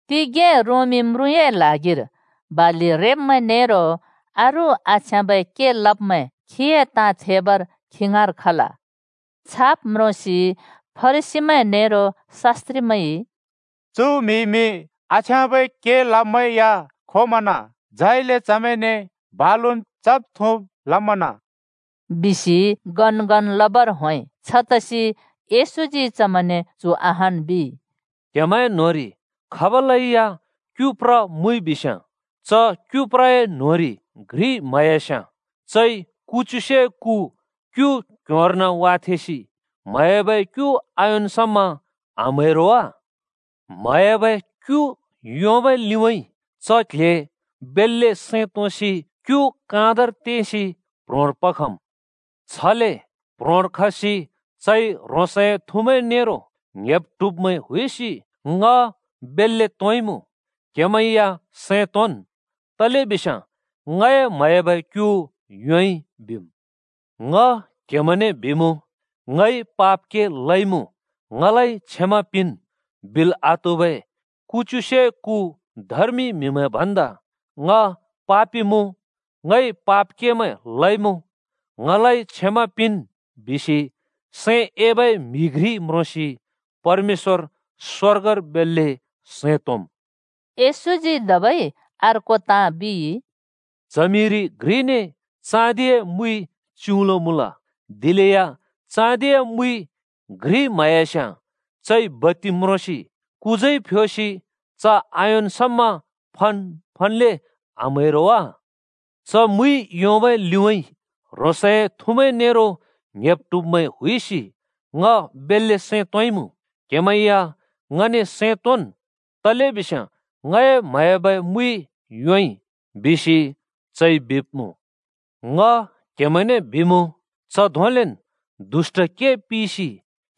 तिगें रोमी म्रुँए ल्हागिर बालि रेब्‍मैं नेरो अरू आछ्याँबै के लब्मैं खीए ताँ थेबर खीए ङाँर खल। छाब् म्रोंसि फरिसीमैं नेरो शास्‍त्रिमैंइ “चु म्‍हिइमि आछ्याँबै के लब्मैं या खोमन। झाइले चमैंने बालुन् चब् थुँब् लमन बिसि,” गनगन लबर होंइ। छतसि येशूजी चमैंने चु अहान् बिइ, “क्‍हेमैं न्‍होंरि खाबलैया क्‍यु प्र मुइबिस्‍याँ च क्यु प्रए न्‍होंरि घ्रि म्‍हयास्‍याँ चइ कुच्युसे कु क्यु क्ह्‍योंर्न वाथेंसि म्हयाबै क्‍यु आयोंन् समा आम्‍है रो वा? म्हयाबै क्यु योंबै लिउँइँ च क्‍ल्‍हे बेल्‍ले सैं तोंसि क्यु काँधर तेंसि प्‍ह्रोंर पखम्। छले प्‍ह्रोंर खसि चइ ह्रोंसए थुमैं नेरो ङ्‌हेब्-ट्हुबमैं हुइसि ‘ङ बेल्‍ले तोंइमुँ, क्‍हेमैं या सैं तोंन्। तलेबिस्याँ ङए म्‍हयाबै क्‍यु योंइ,’ बिम्। “ङ क्हेमैंने बिमुँ, ‘ङइ पाप के लइमुँ ङलाइ क्षमा पिंन्,’ बिल् आत्हुबै कुच्युसे कु धर्मि म्‍हिमैं भन्दा ‘ङ पापि मुँ, ङइ पाप केमैं लइमुँ, ङलाइ क्षमा पिंन्,’ बिसि सैं एबै म्‍हि घ्रि म्रोंसि परमेश्‍वर स्‍वर्गर बेल्‍ले सैं तोंम्।” येशूजी धबै अर्को ताँ बिइ, “च्हमिरि घ्रिने चाँदिए मुइ च्‍युउँलो मुँल। दिलेया चाँदिए मुइ घ्रि म्‍हयास्‍याँ चइ बत्ति म्रोंसि कुजाइ फ्‍योसि च आयोंन् समा फन् फन्‌ले आम्‍है रो वा? च मुइ योंबै लिउँइँ ह्रोंसए थुमैं नेरो ङ्‌हेब्-ट्हुब्‍मैं हुइसि ‘ङ बेल्‍ले सैं तोंइमुँ, क्‍हेमैं या सैं तोंन्। तलेबिस्याँ ङए म्‍हयाबै मुइ योंइ,’ बिसि चइ बिब्मुँ। ङ कहेमैंने बिमुँ, च धोंलेन् दुष्‍ट के पिसि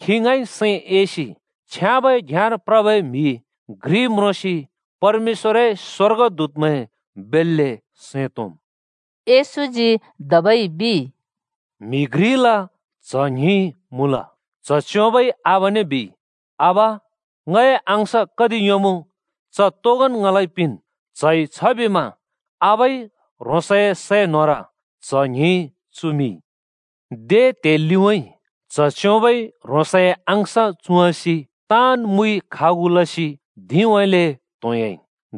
खी ङाँइ सैं एसि छ्याँबै घ्‍याँर प्रबै म्‍हि घ्रि म्रोंसि परमेश्‍वरए स्‍वर्गदूतमैं बेल्‍ले सैं तोंम्।” येशूजी धबै बिइ: “म्‍हि घ्रिल च्‍ह ङ्हिं मुँल। च्‍ह च्‍योंबइ आबाने बिइ, ‘आबा, ङए अँश कति योंमुँ, च तोगोन् ङलाइ पिंन्।’ च्हइ छबिमा आबाइ ह्रोंसए सै न्होर च्‍ह ङ्हिं चुमिंइ। दे त्हे लिउँइँ च्‍ह च्‍योंबइ ह्रोंसए अँश चुँवाँसि ताँन् मुइ खागु लसि धिंउँइँले त्‍होंयाइ।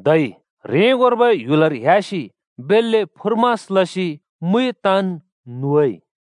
धै ह्रेंगोर्बै ह्‍युलर ह्‍यासि बेल्‍ले फुर्मास लसि मुइ ताँन् नुवाइ।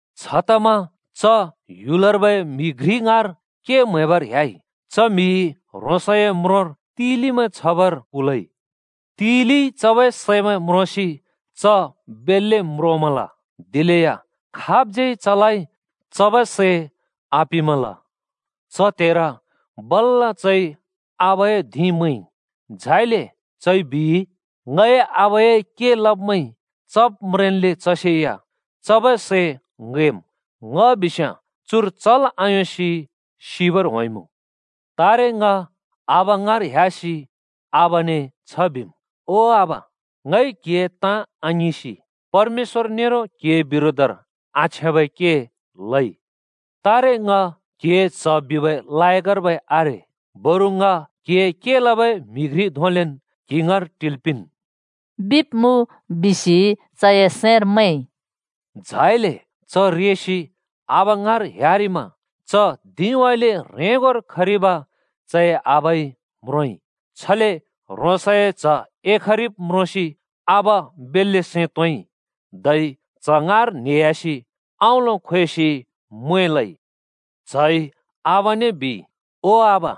छतमा च ह्‍युलर्बै म्‍हि घ्रि ङाँर के म्‍हैबर ह्‍याइ। च म्‍हिइ ह्रोंसए म्रोंर तिलिमैं छबर कुलइ। तिलिइ चबै सैमैं म्रोंसि च बेल्‍ले म्रोमल। दिलेया खाबज्‍यै चलाइ चबै सै आपिंमल। “च त्‍हेर बल्‍ल चइ आबाए धिं मैंइ। झाइले चइ बिइ, ‘ङए आबाए के लब्मैंइ चब् म्रेंन्‍ले चसेया चबै सै ङैंम्, ङ बिस्‍याँ चुर चल् आयोंसि सिबर होंइमुँ। तारे ङ आबा ङाँर ह्‍यासि आबाने छ बिम्, “ओ आबा, ङइ क्हिए ताँ आङिंसि परमेश्‍वर नेरो क्‍हिए बिरोधर आछ्याँबै के लइ। तारे ङ क्‍हिए च्‍ह बिबै लायकर्बै आरे। बरु ङ क्‍हिए के लबै म्‍हि घ्रि धोंलेन् क्‍हि ङाँर टिल् पिंन्,” बिब्मुँ’ बिसि चए सैंर मैंइ। “झाइले च रेसि आबा ङाँर ह्‍यारिमा च धिंउँइँले ह्रेंगोर खरिब चए आबाइ म्रोंइ। छले ह्रोंसए च्ह एखरिब् म्रोंसि आबा बेल्‍ले सैं तोंइ। धै च्‍ह ङाँर न्हेह्‍यासि अँउँलो खोएसि म्वें लइ। च्‍हइ आबाने बिइ, ‘ओ आबा,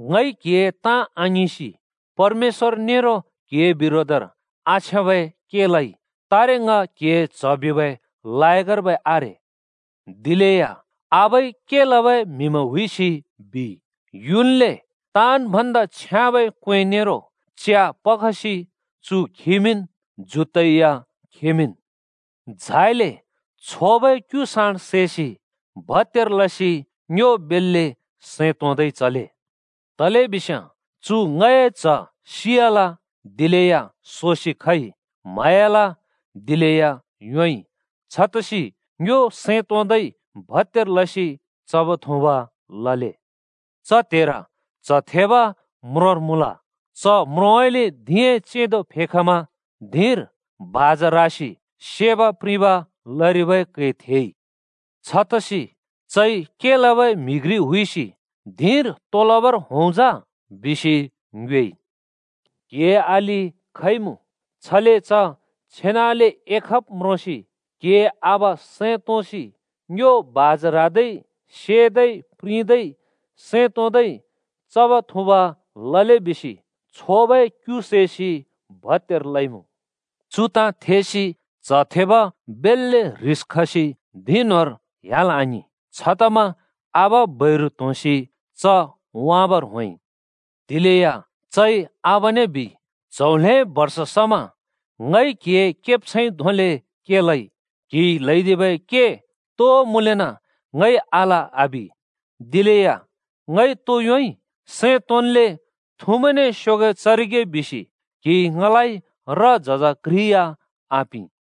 ङइ क्हिए ताँ आङिंसि परमेश्‍वर नेरो क्‍हिए बिरोधर आछ्याँबै के लइ। तारे ङ क्‍हिए च्‍ह बिबै लायकर्बै आरे।’ “दिलेया आबाइ के लबै म्हिमैं हुइसि बिइ, ‘युन्ले ताँन् भन्दा छ्याँबै क्‍वें नेरो च्या पखसि चु खिमिंन्, जुत्‍तै या खिमिंन्। झाइले छोबै क्‍यु साँडे सैसि भत्‍यार लसि ङ्यो बेल्‍ले सैं तोंदै चले। तलेबिस्याँ चु ङए च्‍ह सियाल, दिलेया सोसि खइ; म्‍हयाल, दिलेया योंइ।’ छतसि चमैं सैं तोंदै भत्‍यार लसि चब् थुँब लबर होंइ। “च त्‍हेर च्‍ह थेब म्रोंर मुँल। च म्रोंउँइँले धिंए चेंदो फेखमा धिंर बाजा ह्रासि सेब्-प्रिंब लरिबै कै थेइ। छतसि चइ के लबै म्हि घ्रि हुइसि ‘धिंर तो लबर होंइमुँ जा?’ बिसि ङ्योएइ। “के लबै म्हिइ बिइ, ‘क्‍हिए अलि खइमुँ, छले च छेनाले एखब् म्रोंसि क्‍हिए आबा सैं तोंसि ङ्यो बाजा ह्रादै सेदै प्रिंदै सैं तोंदै चब् थुँब् लले बिसि छोबै क्यु सैसि भत्यार लइमुँ।’ “चु ताँ थेसि च्‍ह थेब बेल्‍ले ह्रिस खसि धिं न्‍होंर ह्‍याल् आङिं। छतमा आबा बैरु त्‍होंसि च वाँबर होंइ। दिलेया चइ आबाने बिइ, ‘च्‍हौ ल्‍हें बर्ष समा ङइ क्‍हिए केब्छैंइ धोंले के लइ। क्‍हिइ ल्‍हैदिबै के तो मुँलेना ङइ आल! आबिमल। दिलेया ङइ तो योंइ? सैं तोंल्‍ले थुमैंने स्‍योगैं चरिगे बिसि क्हिइ र-झज घ्रि या ङ आपिं।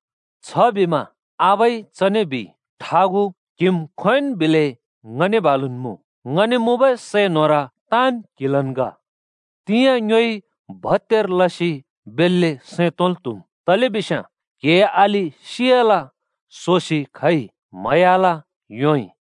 “छबिमा आबाइ चने बिइ, ‘ठागु, क्‍हिम् खोंयोंन् बिलै ङने बालुन् मुँ। ङने मुँबै सै न्होर ताँन् क्‍हिलन् ग। तिंयाँ ङ्योइ भत्‍यार लसि बेल्‍ले सैं तोंल् त्‍हुम्। तलेबिस्याँ क्‍हिए अलि सियाल, सोसि खइ, म्‍हयालेया योंइ।’”